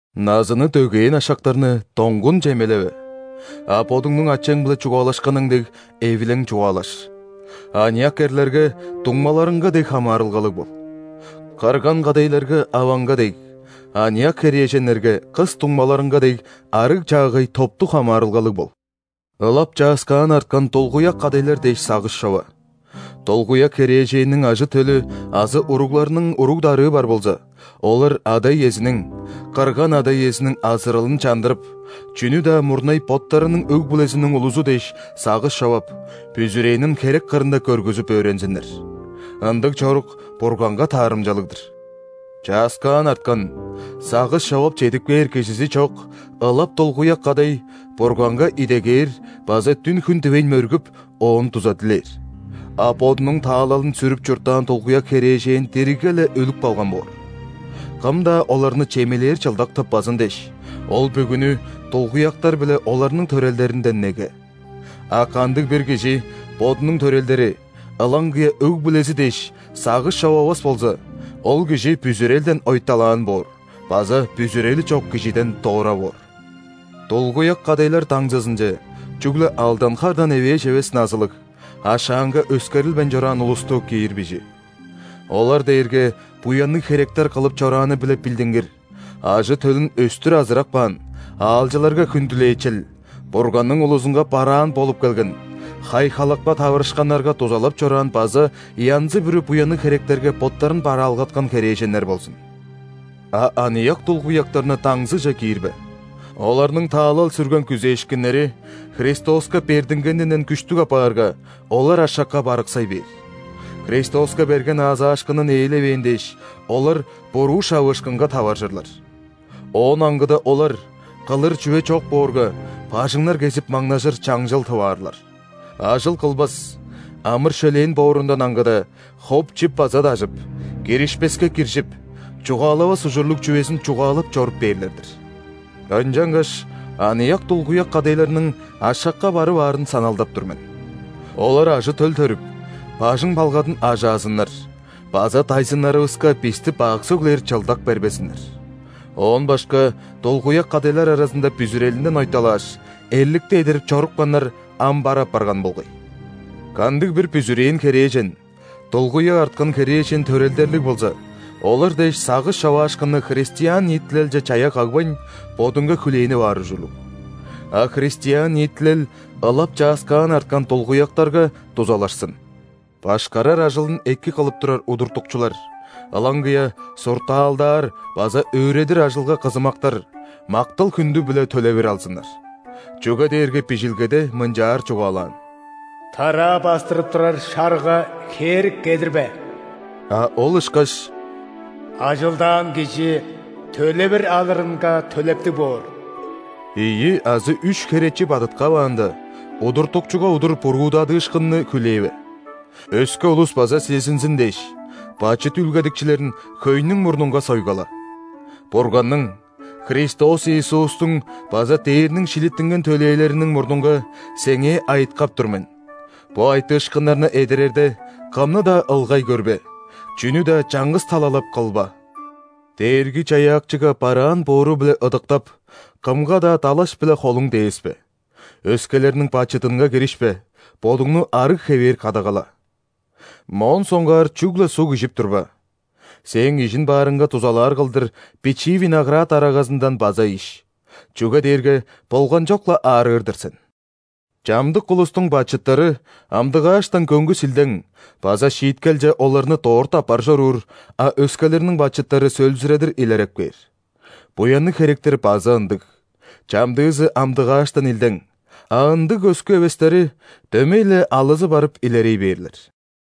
Назыны дөгээн ашактарны доңгун чемелеве, а бодуңнуң ачаң-биле чугаалашканың дег, эвилең чугаалаш. Аныяк эрлерге дуңмаларыңга дег хамаарылгалыг бол. Кырган кадайларга – аваңга дег, аныяк херээженнерге – кыс дуңмаларыңга дег, арыг-чаагай топтуг хамаарылгалыг бол. Ылап чааскаан арткан дулгуяк кадайлар дээш сагыш чова. Дулгуяк херээженниң ажы-төлү азы уругларының уруг-дарыы бар болза, олар ада-иезиниң, кырган ада-иезиниң азыралын чандырып, чүнү-даа мурнай боттарының өг-бүлезиниң улузу дээш сагыш човап, бүзүрээнин херек кырында көргүзүп өөрензиннер. Ындыг чорук Бурганга таарымчалыг-дыр. Чааскаан арткан, сагыш човап чедип кээр кижизи чок ылап дулгуяк кадай Бурганга идегээр база дүн-хүн дивейн мөргүп, Оон дуза дилээр. А бодунуң таалалын сүрүп чурттаан дулгуяк херээжен диригге-ле өлүп калган боор. Кым-даа оларны чемелээр чылдак тыппазын дээш, ол бүгүнү дулгуяктар биле оларның төрелдеринден неге. А кандыг-бир кижи бодунуң төрелдери, ылаңгыя өг-бүлези дээш, сагыш човавас болза, ол кижи бүзүрелден ойталаан боор база бүзүрели чок кижиден дора боор. Дулгуяк кадайлар даңзызынче чүгле алдан хардан эвээш эвес назылыг, ашаанга өскерилбейн чораан улусту киир бижи. Олар дээрге буянныг херектер кылып чорааны-биле билдингир, ажы-төлүн өстүр азырап каан, аалчыларга хүндүлээчел, Бурганның улузунга бараан болуп келген, хай-халапка таварышканнарга дузалап чораан база янзы-бүрү буянныг херектерге боттарын бараалгаткан херээженнер болзун. А аныяк дулгуяктарны даңзыже киирбе. Оларның таалал сүрген күзээшкиннери Христоска бердингенинден күштүг апаарга, олар ашакка барыксай бээр. Христоска берген аазаашкынын ээлевээн дээш, олар буруу шавыышкынга таваржырлар. Оон аңгыда олар, кылыр чүве чок боорга, бажыңнар кезип маңнажыр чаңчыл тып аарлар. Ажыл кылбас, амыр-шөлээн боорундан аңгыда, хоп-чип база дажып, киришпеске киржип, чугаалавас ужурлуг чүвезин чугаалап чоруп бээрлер-дир. Ынчангаш аныяк дулгуяк кадайларның ашакка барып аарын саналдап тур мен. Олар ажы-төл төрүп, бажың-балгадын ажаазыннар база дайзыннарывыска бисти бак сөглээр чылдак бербезиннер. Оон башка дулгуяк кадайлар аразында бүзүрелинден ойталааш, эрликти эдерип чорупканнар ам бар апарган болгай. Кандыг-бир бүзүрээн херээжен дулгуяк арткан херээжен төрелдерлиг болза, олар дээш сагыш човаашкынны христиан ниитилелче чая кагбайн, бодунга хүлээнип аар ужурлуг. А христиан ниитилел ылап чааскаан арткан дулгуяктарга дузалашсын. Башкарар ажылын эки кылып турар удуртукчулар, ылаңгыя суртаалдаар база өөредир ажылга кызымактар, мактал-хүндү биле төлевир алзыннар. Чүге дээрге Бижилгеде мынчаар чугаалаан:«Тараа бастырып турар шарыга хээрик кедирбе»,а ол ышкаш:«Ажылдаан кижи төлевир алырынга төлептиг боор». Ийи азы үш херечи бадыткаваанда, удуртукчуга удур буруудадыышкынны хүлээве. Өске улус база сезинзин дээш, бачыт үүлгедикчилерин хөйнүң мурнунга сойгала. Бурганның, Христос Иисустуң база дээрниң шилиттинген төлээлериниң мурнунга сеңээ айыткап тур мен: бо айтыышкыннарны эдерерде, кымны-даа ылгай көрбе, чүнү-даа чаңгыс талалап кылба. Дээрги-Чаяакчыга бараан боору-биле ыдыктап, кымга-даа далаш-биле холуң дээспе, өскелерниң бачыдынга киришпе, бодуңну арыг хевээр кадагала. Моон соңгаар чүгле суг ижип турба, сээң ижин-баарыңга дузалаар кылдыр бичии виноград арагазындан база иш, чүге дээрге болганчок-ла аарыыр-дыр сен. Чамдык улустуң бачыттары амдыгааштан көңгүс илдең база шииткелче оларны дорт аппар чоруур, а өскелерниң бачыттары сөөлзүредир илереп кээр. Буянныг херектер база ындыг: чамдыызы амдыгааштан илдең, а ындыг көскү эвестери дөмей-ле алызы барып илерей бээрлер.